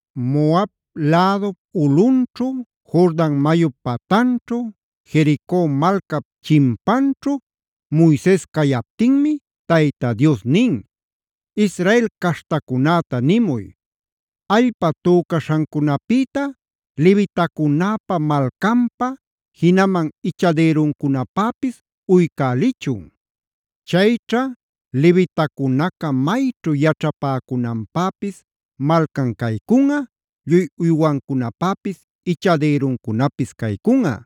Moab lädup ulꞌunćhu, Jordan mayup patanćhu, Jerico malcap chimpanćhu Moises cayaptinmi Tayta Dios nin: “Israel caśhtacunäta nimuy: ‘Allpa tücaśhancunapïta levitacunäpa malcanpa, jinaman ichadïruncunapäpis uycälichun. Chayćha levitacunaca mayćhu yaćhapäcunanpäpis malcan caycunꞌa, lluy uywancunapäpis ichadïruncunapis caycunꞌa.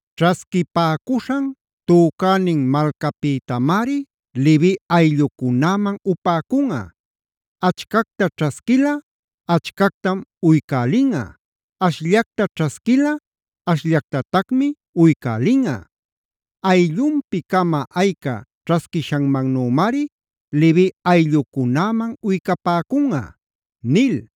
Ćhasquipäcuśhan tücänin malcapïtamari Levi ayllucunäman upäcunꞌa: achcacta ćhasquilꞌa achcactam uycälinꞌa, ashllacta ćhasquilꞌa ashllactatacmi uycälinꞌa. Ayllunpi-cama ayca ćhasquishanmannümari Levi ayllucunäman uycapäcunꞌa’”a nil.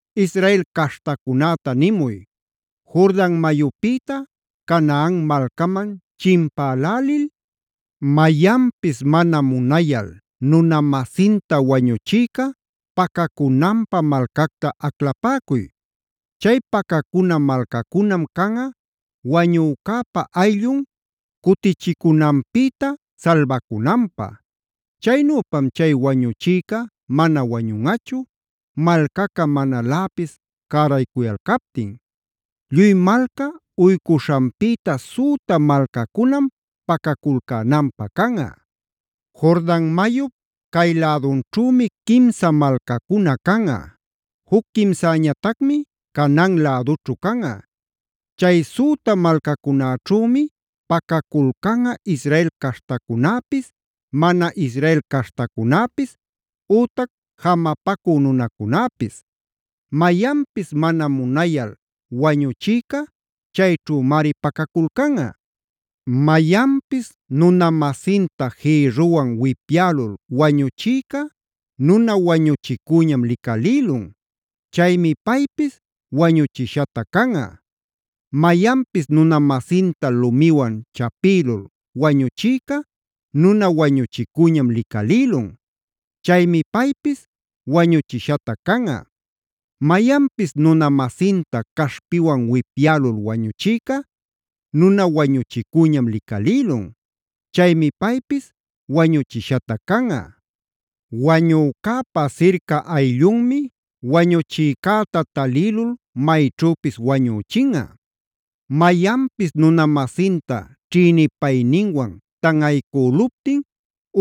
“Israel caśhtacunäta nimuy: ‘Jordan mayupïta Canaan malcaman chimpälälil, mayanpis mana munayal nuna-masinta wañuchïca pacacunanpä malcacta aclapäcuy.b Chay pacacuna malcacunam canꞌa wañücäpa ayllun cutichicunanpïta salbacunanpä. Chaynüpam chay wañuchïca mana wañunꞌachu, malcaca manaläpis cäraycuyalcaptin. Lluy malca uycuśhanpïta süta malcacunam pacaculcänanpä canꞌa. Jordan mayup cay lädunćhümi quimsa malcacuna canꞌa; juc quimsäñatacmi Canaan lädućhu canꞌa. Chay süta malcacunäćhümi pacaculcanꞌa Israel caśhtacunäpis, mana Israel caśhtacunäpis, ütac jamapacü nunacunäpis. Mayanpis mana munayal wañuchïca chayćhümari pacaculcanꞌa. “ ‘Mayanpis nuna-masinta jïrruwan wipyälul wañuchïca nuna wañuchicüñam licalïlun; chaymi paypis wañuchishatac canꞌa. “ ‘Mayanpis nuna-masinta lumiwan chapïlul wañuchïca nuna wañuchicüñam licalïlun; chaymi paypis wañuchishatac canꞌa. “ ‘Mayanpis nuna-masinta caśhpiwan wipyälul wañuchïca nuna wañuchicüñam licalïlun; chaymi paypis wañuchishatac canꞌa. Wañucäpa sirca ayllunmi wañuchïcäta talïlul mayćhüpis wañüchinꞌa. “ ‘Mayanpis nuna-masinta ćhïnipayninwan tanꞌaycüluptin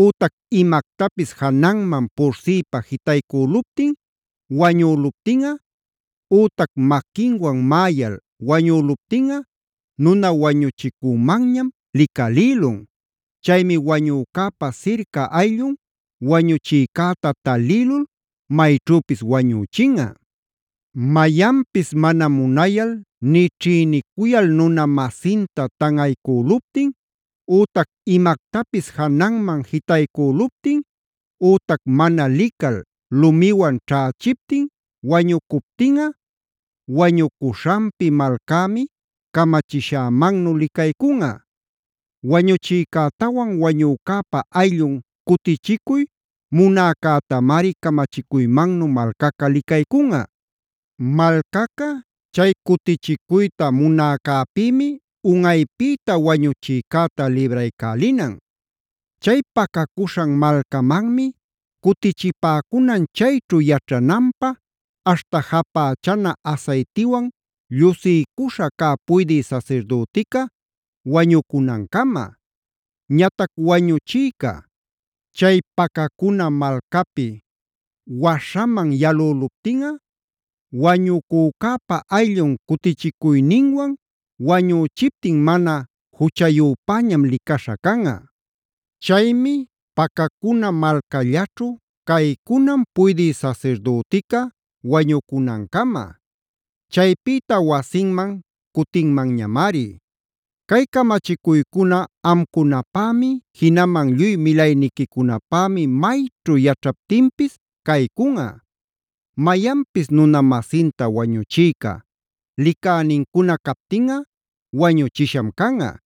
ütac imactapis jananman pursïpa jitaycüluptin wañüluptinꞌa, ütac maquinwan maꞌayal wañüluptinꞌa nuna wañuchicümanñam licalïlun; chaymi wañücäpa sirca ayllun wañuchïcäta talïlul mayćhüpis wañüchinꞌa. “ ‘Mayanpis mana munayal nï ćhïnicuyal nuna-masinta tanꞌaycüluptin ütac imactapis jananman jitaycüluptin, ütac mana lical lumiwan ćhächiptin wañucuptinꞌa, wañucuśhanpi malcämi camachishämannu licaycunꞌa. Wañuchïcätawan wañücäpa ayllun cutichicuy munäcätamari camachicuymannu malcaca licaycunꞌa. Malcaca chay cutichicuyta munäcäpïmi unꞌaypïta wañuchïcäta libraycälinan. Chay pacacuśhan malcamanmi cutichipäcunan chayćhu yaćhananpä, aśhta japächana asaytiwan llusiycuśha cä puydï sasirdütica wañucunancama. “ ‘Ñatac wañuchïca chay pacacuna malcapi waśhaman yalüluptinꞌa, wañucücäpa ayllun cutichicuyninwan wañüchiptin mana juchayüpäñam licaśha canꞌa. Chaymi pacacuna malcallaćhu caycunan puydï sasirdütica wañucunancama. Chaypïta wasinman cutinmanñamari. “ ‘Cay camachicuycuna amcunapämi, jinaman lluy milayniquicunapämi mayćhu yaćhaptinpis caycunꞌa. “ ‘Mayanpis nuna-masinta wañuchïca licänincuna captinꞌa wañuchisham canꞌa.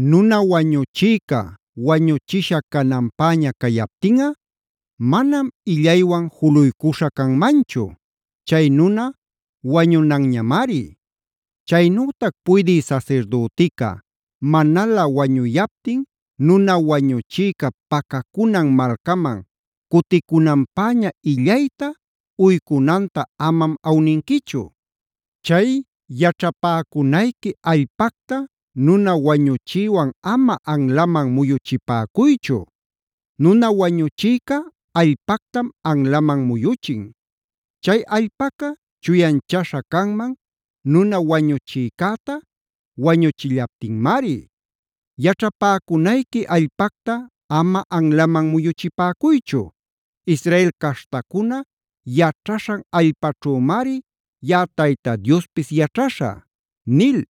“ ‘Nuna wañuchïca wañuchisha cananpäña cayaptinꞌa, manam illaywan juluycuśha canmanchu; chay nuna wañunanñamari. “ ‘Chaynütac puydï sasirdütica manalä wañuyaptin nuna wañuchïca pacacunan malcaman cuticunanpäña illayta uycunanta amam awninquichu. “ ‘Chay yaćhapäcunayqui allpacta nuna wañuchïwan ama anlaman muyuchipäcuychu. Nuna wañuchïca allpactam anlaman muyuchin; chay allpaca chuyanchaśha canman nuna wañuchïcäta wañüchillaptinmari. “ ‘Yaćhapäcunayqui allpacta ama anlaman muyuchipäcuychu; Israel caśhtacuna yaćhaśhan allpaćhümari yaꞌa Tayta Diospis yaćhaśhä’” nil.